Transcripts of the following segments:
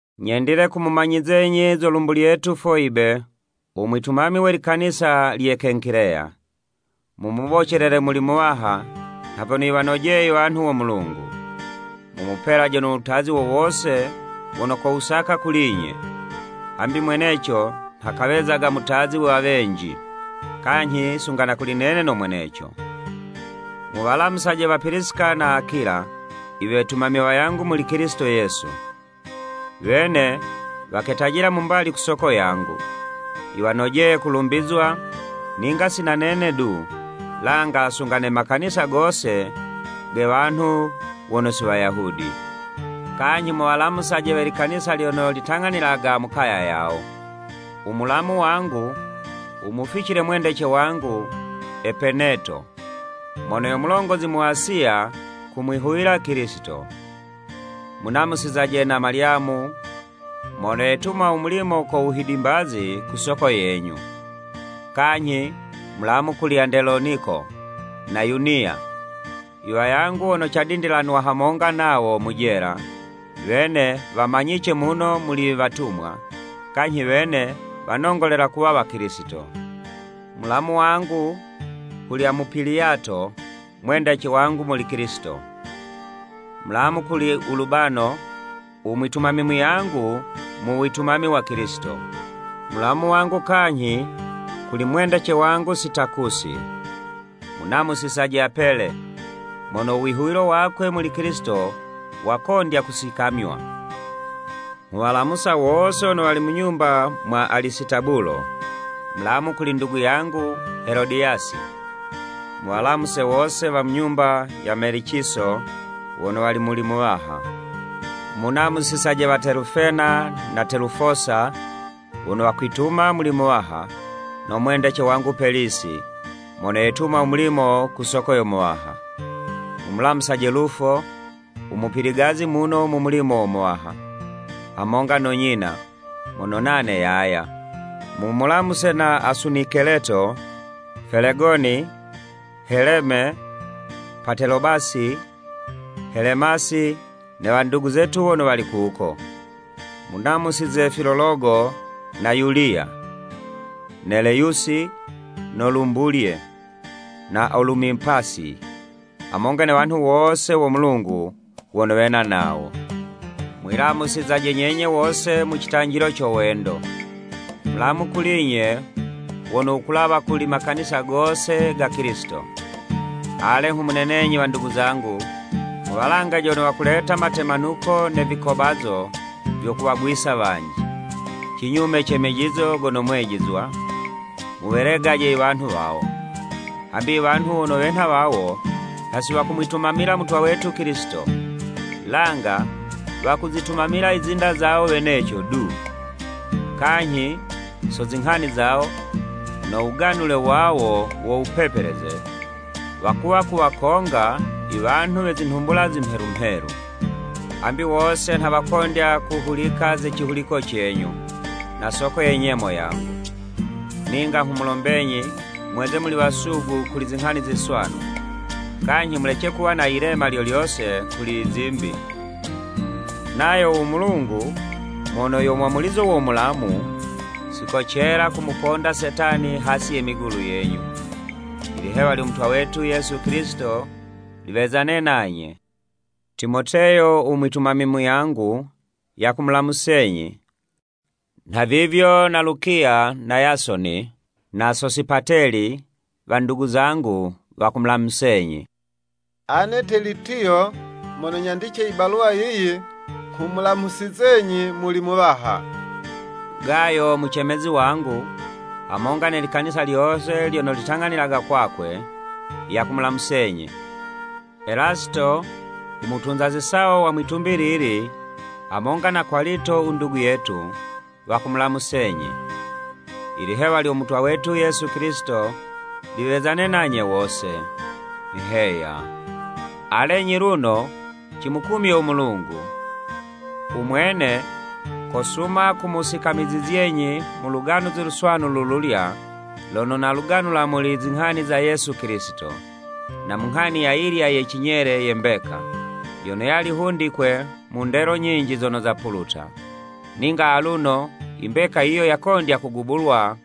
Nyendile kumumanyizenyi zo lumbu lyetu Foyibe, u mwitumami we likanisa lye Kenkileya. Mumubocelele muli Muwaha nha vyono yiwanojeye iwanhu wo Mulungu. Mumupelaje no wutazi wo wose wono kowusaka kuli'nye, hambi mweneco nha kawezaga mutazi wa wenji, kanyhi sunga na kuli nene no mweneco. Muwalamusaje wa Pilisika na Akula iwetumami wayangu muli Kilisito Yesu. Wene waketajila mu mbali ku soko yangu. Yiwanojeye kulumbizwa, ninga si na nene du, langa sunga ne makanisa gose ge wanhu wono si Wayahudi. Kanyhi muwalamusaje we likanisa lyono litang'anililaga mu kaya yawo. U mulamu wangu wumuficile mwendece wangu Epeneto, mono yo mulongozi mu Asiya kumwihuwila Kilisito. Munamusizaje na Malyamu mono yetuma u mulimo ko wuhidimbazi ku soko yenyu. Kanyhi mulamu kuli Andeloniko na Yuniya, iwayangu wono cadindilanwa hamonga nawo mu jela, wene wamanyice muno muli iwatumwa, kanyhi wene wanongolela kuwa Wakilisito. Mulamu wangu kuli Amupiliyato, mwendece wangu muli Kilisito. Mulamu kuli Ulubano, u mwitumami muyangu mu witumami wa Kilisito, mulamu wangu kanyhi kuli wendece wangu Sitakusi. Munamusizaje Apele, mono u wihuwilo wakwe muli Kilisito wakondya kusikamywa. Nghuwalamusa wose wono wali mu nyumba mwa Alisitabulo. Mulamu kuli ndugu yangu Helodiyasi. Muwalamuse wose wa mu nyumba ya Meliciso wono wali muli Muwaha. Munamusizaje wa Telufena na Telufosa, wono wakwituma muli Muwaha, no mwendece wangu Pelisi, mono yetuma u mulimo ku soko yo Muwaha. Mumulamusaje Lufo, u mupiligazi muno mu mulimo wo Muwaha, hamonga no nyina, mono nane, yaya. Mumulamuse na Asunikeleto, Felegoni. Heleme, Patelobasi, Helemasi ne wandugu zetu wono wali kuko. Munamusize Filologo na Yuliya, Neleyusi, no lumbulye, na Olumipasi, hamonga ne wanhu wose wo Mulungu wono wena nawo. Mwilamusizaje nyenye wose mu citanjilo co wendo. Mulamu kuli'nye wono wukulawa kuli makanisa gose ga Kilisito. Ale nghumunenenyi wandugu zangu, muwalangaje wono wakuleta matemanuko ne vikobazo vyo kuwagwisa wanji, cinyume ce mejizo gono mwejizwa, muwelegaje iwanhu wawo. Hambi iwanhu wono wenha wawo, nha si wakumwitumamila Mutwa wetu Kilisito, langa wakuzitumamila izinda zawo weneco du. Kanyhi so zinghani zawo, no wuganule wawo wo wupepeleze, wakuwa kuwakonga iwanhu we zinhumbula zimhelu mhelu. Hambi wose nha wakondya kuhulika ze cihuliko cenyu, na yo soko ye nyemo yangu. Ninga nghumulombenyi mweze muli wasugu kuli zinghani ziswanu, kanyhi mulece kuwa na yilema lyo lyose kuli izimbi. Nayo u Mulungu mono yo mwamulizo wo mulamu, sikocela kumuponda Setani hasi ye migulu yenyu. Ilihewa lyo Mutwa, wetu Yesu Kilisito, liwezane nanye. Timoteyo u mwitumami muyangu, yakumulamusenyi, nha vivyo na Lukiya na Yasoni, na Sosipateli, wandugu zangu, wakumulamusenyi. Ane Telitiyo mono nyandice i baluwa yiyi, nghumulamusizenyi muli Muwaha. Gayo mucemezi wangu, hamonga ne likanisa lyose lyono litang'anililaga kwakwe, yakumulamusenyi. Elasito u mutunza zisawo wa mwi'tumbi lili, hamonga na Kwalito u ndugu, wakumulamusenyi. [ Ilihewa lyo Mutwa wetu Yesu Kilisito liwezane nanye wose. Heya.] Alenyi luno cimukumye u Mulungu! U Mwene kosuma kumusikamizizyenyi mu Luganuzi Luswanu lululya, lono naluganula muli zinghani za Yesu Kilisito, na mu nghani ayilya ye cinyele ye mbeka, yono yali hundikwe mu ndelo nyinji zono zapuluta. Ninga aluno, imbeka yiyo yakondya kugubulwa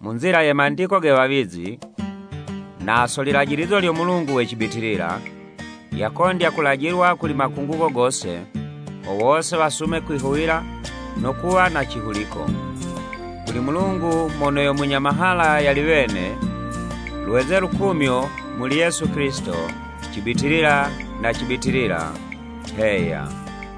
mu nzila ye Mandiko ge wawizi, na so lilajilizo lyo Mulungu we cibitilila, yakondya kulajilwa kuli makungugo gose, ho wose wasume kwihuwila no kuwa na cihuliko. Kuli Mulungu mono yo munya mahala yali wene, lweze lukumyo muli Yesu Kilisito, cibitilila ne cibitilila! Heya.